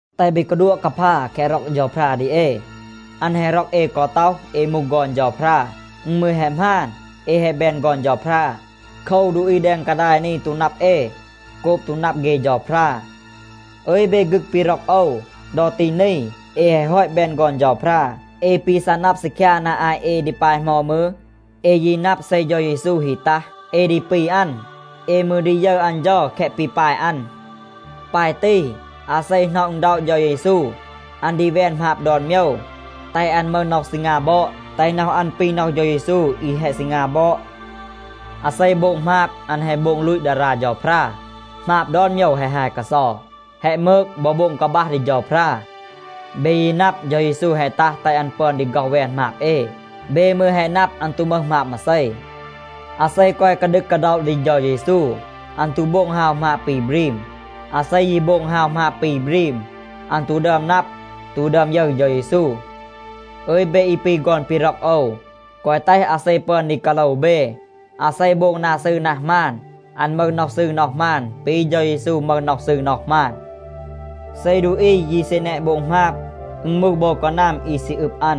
แตห เบ กาดัวะ กาพา แคะ ร็อก เฌาพรา ดี เอ. อัน แฮะ ร็อก เอ กอ ต็อห, เอ มูห ฆอน เฌาพรา. อึณ มืร แฮะ หมาน, เอ แฮะ แบน ฆอน เฌาพรา. โคว, ดูอี แดง กาดาย นี ตู นับ เอ โกบ ตู นับ เฆ เฌาพรา. อึย เบ ฆึก ปี ร็อก โอว, ดอ ตี นี เอ แฮะ ฮอต แบน ฆอน เฌาพรา. เอ ปี ซัะ นับ ซีคยา นา อาต เอ ดี ปาย เหมา มืร, เอ ยี นับ เซ เฌา เยซู ฮี ตัห, เอ ดี ปี อัน. เอ มืร ดี ยึร อัน เฌา แคะ ปี ปาย อัน. ปาย ตี, อาเซ หน็อะ อึณด็อะ เฌา เยซู, อัน ดี แวน หมาบ ดอน โมยว, แตห อัน มึห น็อห ซีงา บอด, แตห น็อห อัน ปี น็อห เฌา เยซู อี แฮะ ซีงา บอด. อาเซ โบง หมาบ, อัน แฮะ โบง ลูต ดารา เฌาพรา. หมาบ ดอน โมยว แฮะ ฮาย กาเซา, แฮะ มืก บอ โบง กาบัห ดี เฌาพรา. เบ ยี แฮะ นับ, เฌา เยซู แฮะ ตัห, แตห อัน ปึอน ดี ฆ็อห แวน หมาบ เอ. เบ มืร แฮะ นับ, อัน ตู มึห หมาบ มาเซ. อาเซ กอย กาดึก กาด็อะ ดี เฌา เยซู, อัน ตู โบง ฮาว หมาบ ปี บรีม. อาเซ ยี โบง ฮาว หมาบ ปี บรีม, อัน ตู ดึอม นับ, ตู ดึอม ยึร เฌา เยซู. อึย เบ อี ปี ฆอน ปี ร็อก โอว, แกวะ แตห อาเซ ปึอน ดี กาโลว เบ. อาเซ โบง นา ซืร นา หมาน, อัน มึห น็อห ซืร น็อห หมาน ปี เฌา เยซู มึห น็อห ซืร น็อห หมาน. เซ ดูอี ยี ซี แนะ โบง หมาบ, อึณ มูห โบว กานัม อี ซี อึบ อัน.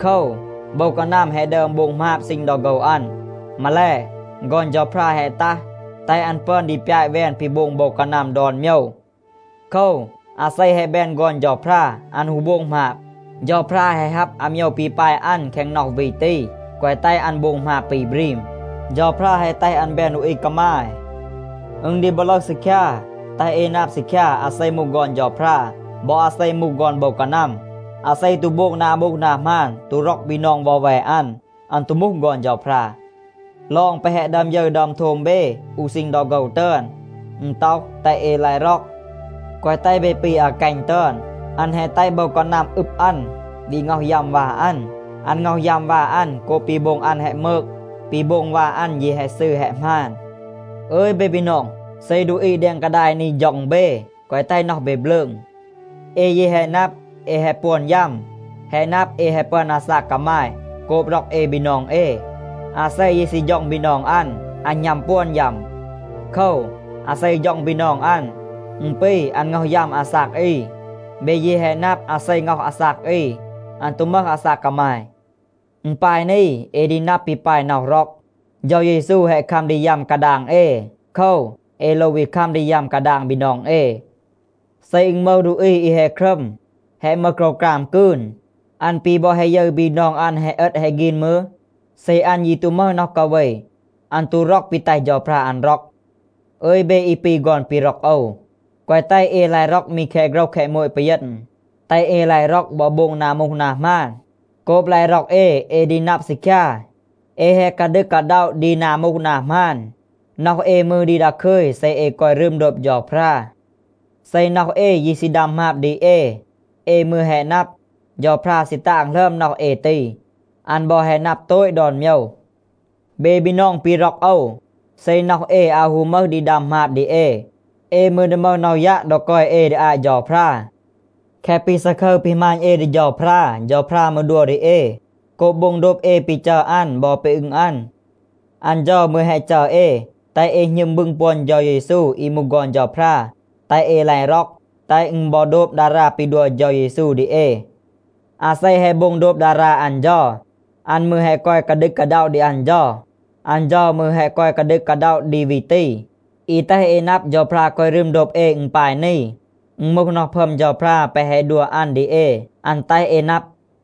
โคว, โบว กานัม แฮะ ดึอม โบง หมาบ ซีณ ดอ โฆว อัน. มาแล, ฆอน เฌาพรา แฮะ ตัห, แตห อัน ปึอน ดี ปยาต แวน ปี โบง โบว กานัม ดอน โมยว. โคว, อาเซ แฮะ แบน ฆอน เฌาพรา, อัน ฮู โบง หมาบ. เฌาพรา แฮะ ฮับ อาโมยว ปี ปาย อัน แคง น็อห วี ตี, แกวะ แตห อัน โบง หมาบ ปี บรีม. เฌาพรา แฮะ แตห อัน แบน ดูอี กามาย. อึณ ดี บอ ลึห ซีคยา, แตห เอ นับ ซีคยา, อาเซ มูห ฆอน เฌาพรา บอ อาเซ มูห ฆอน โบว กานัม. อาเซ ตู โบง นา มูห นา หมาน, ตู ร็อก บีนอง วอแว อัน, อัน ตู มูห ฆอน เฌาพรา. ลอง แปะ แฮะ ดึอม ยึร ดึอม โทม เบ อู ซีณ ดอ โฆว ตึอน, อึณ ต็อห, แตห เอ ลาย ร็อก. แกวะ แตห เบ ปี อากัณ ตึอน. อัน แฮะ แตห โบว กานัม อึบ อัน, วี ง็อห ยัม วา อัน. อัน ง็อห ยัม วา อัน โกบ ปี โบง อัน แฮะ มืก. ปี โบง วา อัน ยี แฮะ ซืร แฮะ หมาน. อึย เบ บีนอง, เซ ดูอี แดง กาดาย นี ฌ็อง เบ, แกวะ แตห น็อห เบ บลืง. เอ ยี แฮะ นับ, เอ แฮะ ปวน ยัม. แฮะ นับ, เอ แฮะ ปึอน อาซาก กามาย โกบ ร็อก เอ บีนอง เอ. อาเซ ยี ซี ฌ็อง บีนอง อัน, อัน หณัม ปวน ยัม. โคว, อาเซ ฌ็อง บีนอง อัน, อึณ ปี อัน ง็อห ยัม อาซาก อี. เบ ยี แฮะ นับ, อาเซ ง็อห อาซาก อี, อัน ตู มึห อาซาก กามาย. อึณ ปาย นี, เอ ดี นับ ปี ปาย น็อห ร็อก. เฌา เยซู แฮะ คัม ดี ยัม กาดาง เอ. โคว, เอ โลว วี คัม ดี ยัม กาดาง บีนอง เอ. เซ อึณ มึห ดูอี อี แฮะ ครัม, แฮะ มึห โกรวกราม กืน, อัน ปี บอ แฮะ ยึร บีนอง อัน แฮะ เอต แฮะ ฆีน มืร, เซ อัน ยี ตู มึห น็อห กาเว, อัน ตู ร็อก ปี แตห เฌาพรา อัน ร็อก. อึย เบ อี ปี ฆอน ปี ร็อก โอว, แกวะ แตห เอ ลาย ร็อก มี แคะ โฆรห แคะ โมต ปีเยณ. แตห เอ ลาย ร็อก บอ โบง นา มูห นา หมาน. โกบ ลาย ร็อก เอ, เอ ดี นับ ซีคยา, เอ แฮะ กาดึก กาด็อะ ดี นา มูห นา หมาน. น็อห เอ มืร ดี ดาคึย เซ เอ กอย รึม โดบ เฌาพรา. เซ น็อห เอ ยี ซี ดัม หมาบ ดี เอ, เอ มืร แฮะ นับ, เฌาพรา ซี ตาง หลึอม น็อห เอ ตี. อัน บอ แฮะ นับ โตต ดอน โมยว. เบ บีนอง ปี ร็อก โอว, เซ น็อห เอ อาว ฮู มึห ดี ดัม หมาบ ดี เอ, เอ มืร ดี มึห น็อห ยัะ ดอ กอย เอ ดี อาต เฌาพรา. แคะ ปี ซาคึร ปี หมาณ เอ ดี เฌาพรา, เฌาพรา มืร ดัว ดี เอ โกบ โบง โดบ เอ ปี จัร อัน บอ ปี อึง อัน. อัน เฌา มืร แฮะ จัร เอ, แตห เอ หณึม บึง ปวน เฌา เยซู อี มูห ฆอน เฌาพรา, แตห เอ ลาย ร็อก, แตห อึณ บอ โดบ ดารา ปี ดัว เฌา เยซู ดี เอ. อาเซ แฮะ โบง โดบ ดารา อัน เฌา, อัน มืร แฮะ กอย กาดึก กาด็อะ ดี อัน เฌา. อัน เฌา มืร แฮะ กอย กาดึก กาด็อะ ดี วี ตี. อี แตห เอ นับ, เฌาพรา กอย รึม โดบ เอ, อึณ ปาย นี. อึณ มูห น็อห พึอม เฌาพรา แปะ แฮะ ดัว อัน ดี เอ, อัน แตห เอ นับ.